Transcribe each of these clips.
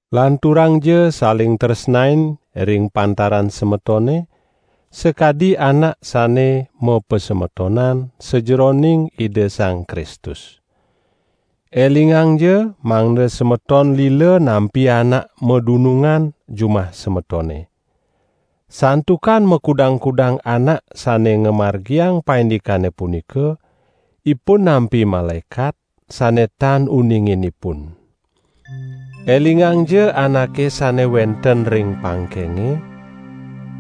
Lanturangja saling tresnain ring pantaran semetone, sakadi anak sane mapasemetonan sajeroning Ida Sang Kristus. Elingangja mangda semeton lila nampi anak madunungan jumah semetone. Santukan makudang-kudang anak sane ngamargiang paindikane punika, ipun nampi malaekat, sane tan uningin ipun. Elingangja anake sane wenten ring pangkenge,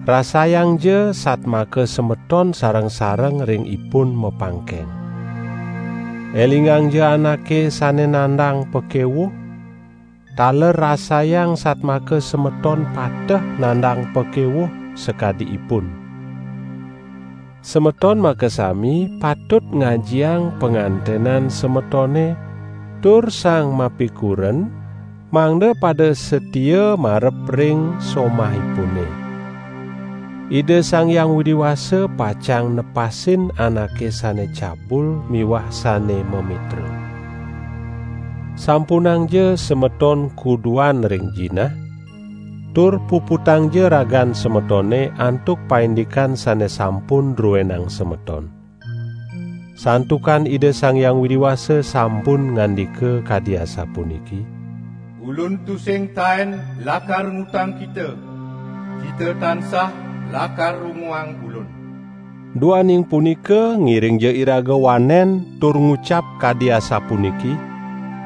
rasayangja satmaka semeton sareng-sareng ring ipun mapangkeng. Elingangja anake sane nandang pakewuh, taler rasayang satmaka semeton pateh nandang pakewuh sakadi ipun. Semeton makasami patut ngajiang pangantenan semetone tur sang mapikuren mangda pada satia marep ring somahipune. Ida Sang Hyang Widi Wasa pacang nepasin anake sane cabul miwah sane mamitra. Sampunangja semeton kuduan ring jinah, tur puputangja ragan semetone antuk paindikan sane sampun druenang semeton. Santukan Ida Sang Hyang Widi Wasa sampun ngandika kadi asapuniki: "Ulun tusing taen lakar ngutang kita; kita tansah lakar runguang Ulun." Duaning punika ngiringja iraga wanen tur ngucap kadi asapuniki: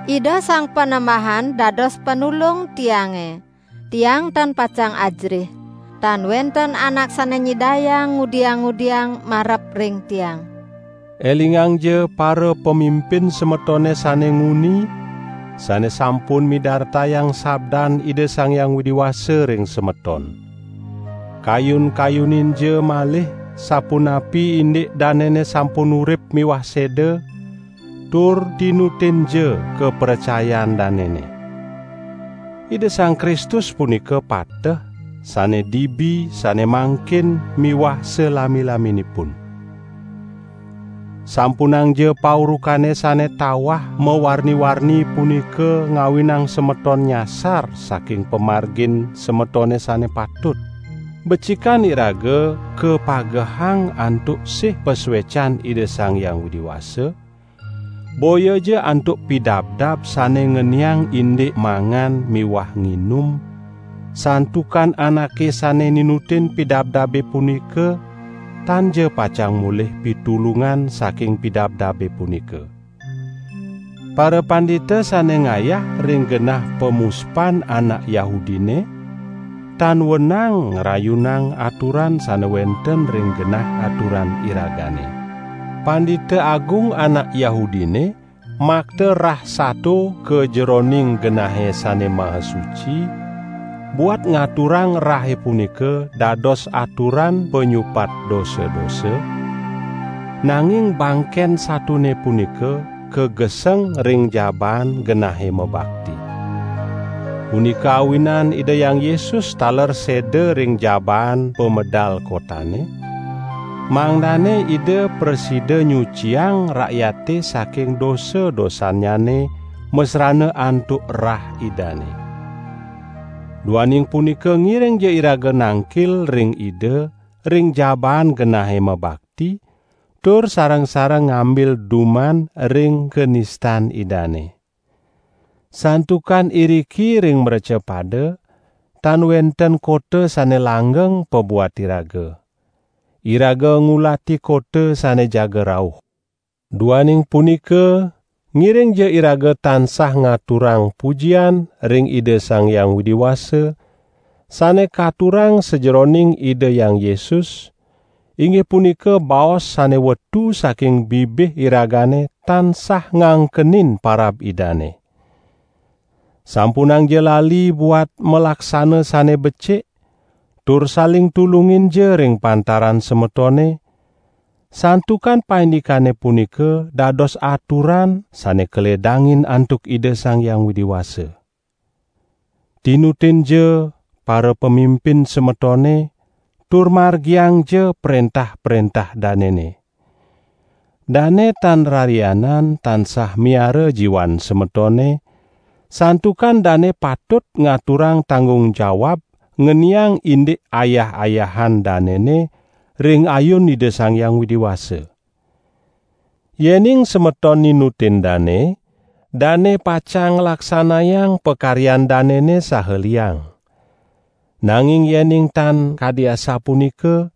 "Ida Sang Panembahan dados Panulung tiange, tiang tan pacang ajerih. Tan wenten anak sane nyidayang ngudiang-ngudiang marep ring tiang." Elingangja parapamimpin semetone sane nguni, sane sampun midartayang sabdan Ida Sang Hyang Widi Wasa ring semeton. Kayun-kayuninja malih sapunapi indik danene sampun urip miwah seda, tur tinutinja kapracayan danene. Ida Sang Kristus punika pateh, sane dibi, sane mangkin miwah salami-laminipun. Sampunangja paurukane sane tawah mawarni-warni punika ngawinang semeton nyasar saking pamargin semetone sane patut. Becikan iraga kapagehang antuk sih pasuecan Ida Sang Hyang Widi Wasa, boyaja antuk pidabdab sane ngeniang indik mangan miwah nginum, santukan anake sane ninutin pidabdabe punika tanja pacang molih pitulungan saking pidabdabe punika. Parapandita sane ngayah ring genah pamuspan anak Yahudine tan wenang ngrayunang aturan sane wenten ring genah aturan iragane. Pandita Agung anak Yahudine makta rah sato ka jeroning Genahe Sane Maha Suci buat ngaturang rahe punika dados aturan panyupat dosa-dosa; nanging bangken satone punika kageseng ring jabaan genahe mabakti. Punika awinan Ida Hyang Yesus taler seda ring jabaan pamedal kotane, mangdane Ida prasida nyuciang rakyate saking dosa-dosannyane masrana antuk rah Idane. Duaning punika ngiringja iraga nangkil ring Ida ring jabaan genahe mabakti tur sareng-sareng ngambil duman ring kanistan Idane. Santukan iriki ring mrecapada tan wenten kota sane langgeng pabuat iraga. Iraga ngulati kota sane jaga rauh. Duaning punika, ngiringja iraga tansah ngaturang pujian ring Ida Sang Hyang Widi Wasa, sane katurang sajeroning Ida Hyang Yesus, inggih punika baos sane wetu saking bibih iragane tansah ngangkenin parab Idane. Sampunangja lali buat malaksana sane becik tur saling tulunginja ring pantaran semetone, santukan paindikane punika dados aturan sane kaledangin antuk Ida Sang Hyang Widi Wasa. Tinutinja parapamimpin semetone tur margiangja prentah-prentah danene. Dane tan rarianan tansah miara jiwan semetone, santukan dane patut ngaturang tanggung jawab ngeniang indik ayah-ayahan danene ring ayun Ida Sang Hyang Widi Wasa. Yening semeton ninutin dane, dane pacang nglaksanayang pakaryan danene saha liang. Nanging yening tan kadi asapunika,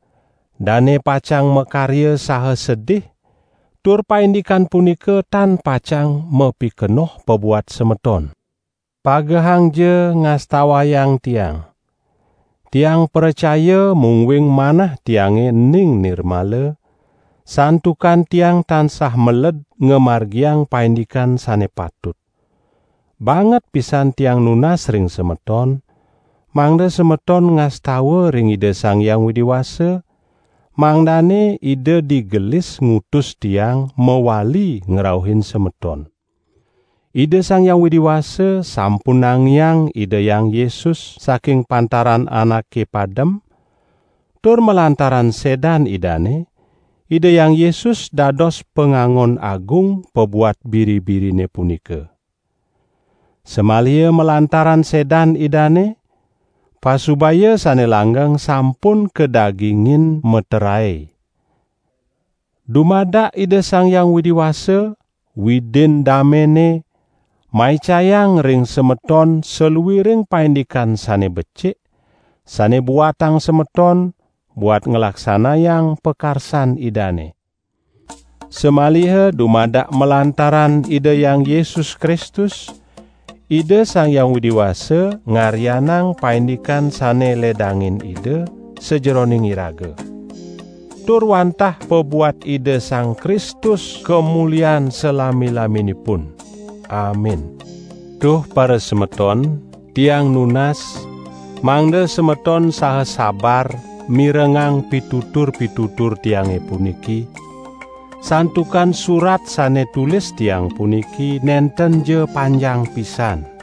dane pacang makarya saha sedih, tur paindikan punika tan pacang mapikenoh pabuat semeton. Pagehangja ngastawayang tiang. Tiang pracaya mungguing manah tiange ening nirmala, santukan tiang tansah meled ngamargiang paindikan sane patut. Banget pisan tiang nunas ring semeton, mangda semeton ngastawa ring Ida Sang Hyang Widi Wasa, mangdane Ida digelis ngutus tiang mawali ngrauhin semeton. Ida Sang Hyang Widi Wasa sampun nangiang Ida Hyang Yesus saking pantaran anake padem tur malantaran sedan Idane, Ida Hyang Yesus dados Pangangon Agung pabuat biri-birine punika. Samaliha malantaran sedan Idane, pasubaya sane langgeng sampun kadagingin meterae. Dumadak Ida Sang Hyang Widi Wasa, Widin damene, maicayang ring semeton saluiring paindikan sane becik, sane buatang semeton buat nglaksanayang pakarsan Idane. Samaliha dumadak malantaran Ida Hyang Yesus Kristus, Ida Sang Hyang Widi Wasa ngaryanang paindikan sane ledangin Ida, sajeroning iraga. Tur wantah pabuat Ida Sang Kristus kamulian salami-laminipun. Amin. Duh parasemeton, tiang nunas, mangda semeton saha sabar mirengang pitutur-pitutur tiange puniki, santukan surat sane tulis tiang puniki nentenja panjang pisan.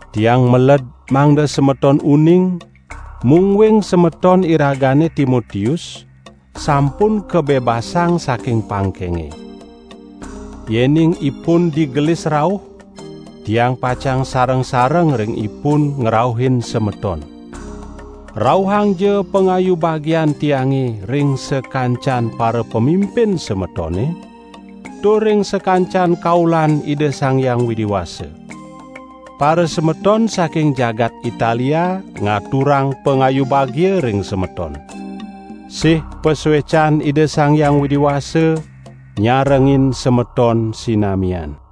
Tiang meled, mangda semeton uning, mungguing semeton iragane Timotius sampun kabebasang saking pangkenge. Yening ipun digelis rauh, tiang pacang sareng-sareng ring ipun ngrauhin semeton. Rauhangja pangayu bagian tiange ring sakancan parapamimpin semetone tur ring sakancan kaulan Ida Sang Hyang Widi Wasa. Parasemeton saking jagat Italia ngaturang pangayu bagia ring semeton. Sih pasuecan Ida Sang Hyang Widi Wasa nyarengin semeton sinamian.